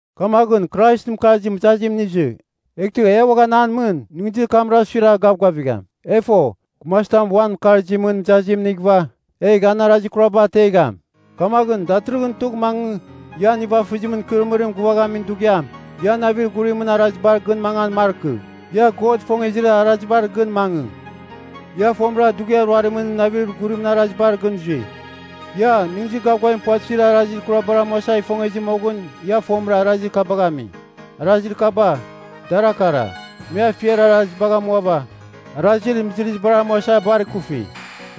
Kamaghɨn Kraisɨn mɨkarzim mɨzazim inizɨ, eghtɨ e uaghan an mɨn nɨghnɨzir kamra suiragh gavgavigham. E fo, gumazitam uan mɨkarzimɨn mɨzazim inighɨva, egh an arazir kuraba ategham. Kamaghɨn datɨrɨghɨn tugh mangɨ, ian nivafɨzimɨn ikɨrɨmɨrim gɨvaghamin dughiam, ia navir ghurimɨn arazibar gɨn mangan markɨ; ia God ifongezir arazibar gɨn mangɨ. Ia fomɨra dughiar ruarimɨn navir ghurimɨn arazibar gɨn zui. Ia, nɨghnɨzir gavgavim puvatɨzibar arazir kurabar amuasa ifongezɨ moghɨn ia fomɨra arazir kabagh ami. Arazir kaba, dara kara: me afiar arazibagh amuava; arazir mɨzɨrɨzibar amuasa bar kufi;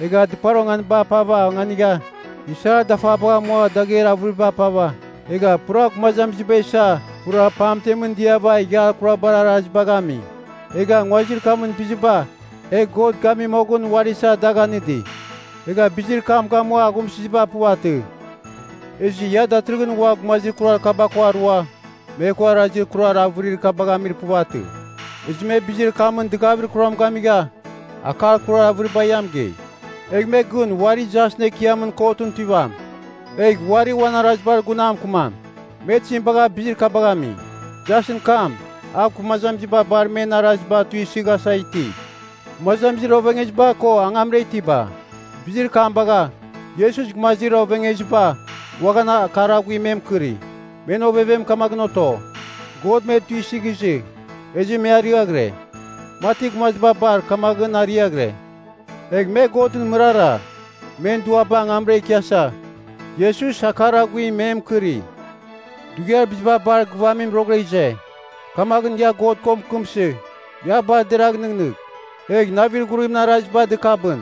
egha dɨpar onganiba apava onganigha; isar dafabagh amua dagher avɨriba apava, egha pura gumazamiziba isa pura pamtemɨn diava ighiar kurabar arazibagh ami; egha nguazir kamɨn biziba e God gami moghɨn uari isa dagh anɨdi, egha bizir kam gamua aghumsɨziba puvatɨ. Ezɨ ia datɨrɨghɨn ua gumazir kurar kaba ko arua, me ko arazir kurar avɨrir kabagh amir puvatɨ. Ezɨ me bizir kamɨn dɨgavir kuram gamigha, akar kurar avɨribar ia mɨgei. Egh me gɨn uari jasɨn ekiamɨn kotɨn tuivam, egh uari uan arazibar gun a mɨkɨmam, me tizim bagha bizir kabagh ami. Jasɨn kam, a gumazamiziba bar men araziba tuisɨghasa iti, gumazamizir ovengeziba ko angamra itiba. Bizir kam bagha, Iesus gumazir ovengeziba uaghan akar aghuim me mɨkɨri. Men ovevem kamaghɨn oto, God me tuisɨghizɨ, ezɨ me arɨaghɨre, mati gumaziba bar kamaghɨn ariaghɨre. Egh me Godɨn mɨrara, men duaba angamra ikiasa, Iesus akar aghuim me mɨkɨri. Dughiar biziba bar gɨvamim roghɨra ize. Kamaghɨn ia God ko mɨkɨmsɨ, ia bar deragh nɨghnɨgh, egh navir ghurimɨn araziba dɨkabɨn.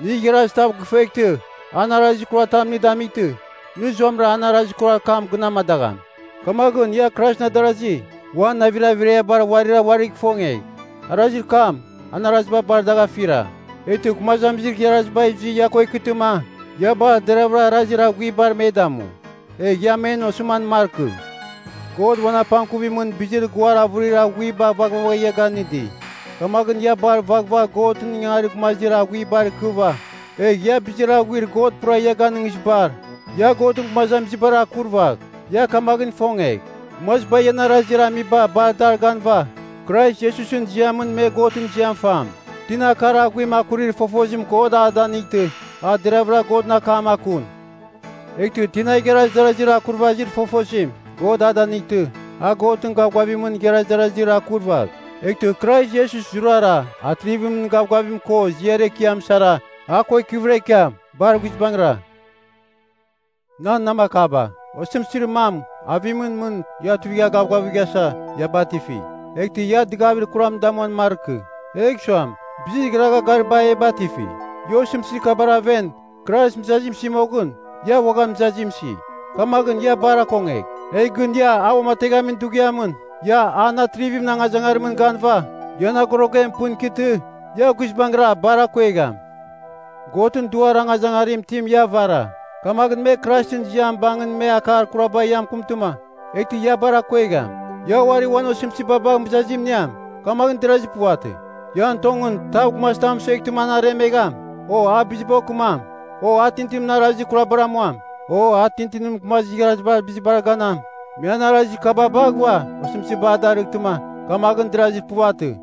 Nɨ igharaz tav gifueghtɨ, an arazir kuratam nɨ damightɨ, nɨ zuamɨra an arazir kurar kam gɨn amadagham. Kamaghɨn ia Kraisɨn adarazi, uan navir averiabar uarira uarigh ifongegh. Arazir kam an araziba bar dagh afira. Eghtɨ gumazamizir igharaziba izɨ ia ko ikɨtɨma, ia bar deravɨra arazir aghuibar me damu. Egh ia men osɨman markɨ. God uan apangkuvimɨn bizir guar avɨrir aghuiba vaghvagha ia ganɨdi. Kamaghɨn ia bar vaghvagh Godɨn ingangarir gumazir aghuibar ikɨva, egh ia bizir aghuir God pura ia ganɨngizibar, ia Godɨn gumazamizibar akurvagh. Ia kamaghɨn ifongegh, gumaziba ian arazir amiba bar dar ganɨva, Krais Iesusɨn ziamɨn me Godɨn ziam fam. Tina akar aghuim akurir fofozim God a danightɨ, a deravɨra Godɨn akam akun. Eghtɨ tina igharaz darazir akurvazir fofozim, God a danightɨ, a Godɨn gavgavimɨn igharaz darazir akurvagh. Eghtɨ Krais Iesus zurara, atrivimɨn gavgavim ko ziar ekiam sara, a ko ikɨvɨra ikiam. Bar guizbangɨra. Nan namakaba, osɨmtɨzir mam avimɨn mɨn ia tuivigh gavgavighasa ia batifi. Eghtɨ ia dɨgavir kuram damuan markɨ, egh suam, bizir igharagha gariba e batifi. Ia osɨmtɨzir kabar aven Krais mɨzazim isi moghɨn, ia uaghan mɨzazim isi. Kamaghɨn ia bar akongegh. Egh gɨn ia a uamateghamin dughiamɨn ia an atrivimɨn angazangarimɨn ganɨva ian agorogem pɨn ikɨtɨ, ia guizbangɨra bar akuegham. Godɨn Duar angazangarim itim ia avara. Kamaghɨn me Kraisɨn ziam bangɨn me akar kuraba ia mɨkɨmtɨma, eghtɨ ia bar akuegham. Ia uari uan osɨmtɨziba bagh mɨzazim iniam, kamaghɨn derazir puvatɨ. Ian tongɨn tav gumazitam mɨsueghtɨma an aremegham, o a biziba okɨmam, o a tintinimɨn arazir kurabar amuam, o a tintinimɨn gumazir igharazibar bizibar ganam, me an arazir kaba baghɨva osɨmtɨzim a darɨghtɨma, kamaghɨn derazir puvatɨ.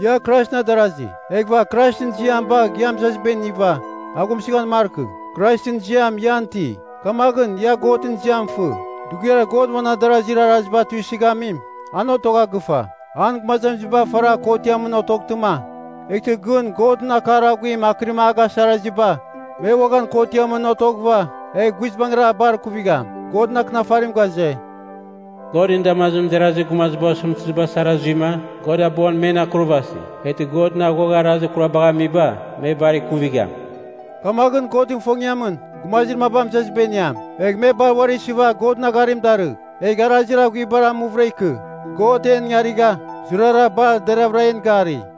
Ia Kraisɨn adarazi, eghɨva Kraisɨn ziam bagh ia mɨzaziba iniva, aghumsɨghan markɨ. Kraisɨn ziam ian iti, kamaghɨn ia Godɨn ziam fɨ. Dughiar God uan adarazir araziba tuisɨghamim, an otogha gɨfa. An gumazamiziba faragh kotiamɨn otoghtɨma, eghtɨ gɨn Godɨn akar aghuim akɨrim ragha a gasarazir gumaziba me uaghan kotiamɨn otoghɨva, egh guizbangɨra bar kuvigham. Godɨn Akɨnafarim ghaze, “Godɨn damazimɨn derazir gumaziba osɨmtɨziba sara zuima, God abuan men akurvasi. Eghtɨ Godɨn aghuagha arazir kurabagh amiba, me bar ikuvigham.” Kamaghɨn Godɨn ifongiamɨn, gumazir maba mɨzaziba iniam, egh me bar uari isɨva Godɨn agharim darɨgh, egh arazir aghuibar amuvɨra ikɨ God en ingarigha, zurara bar deravɨra en gari.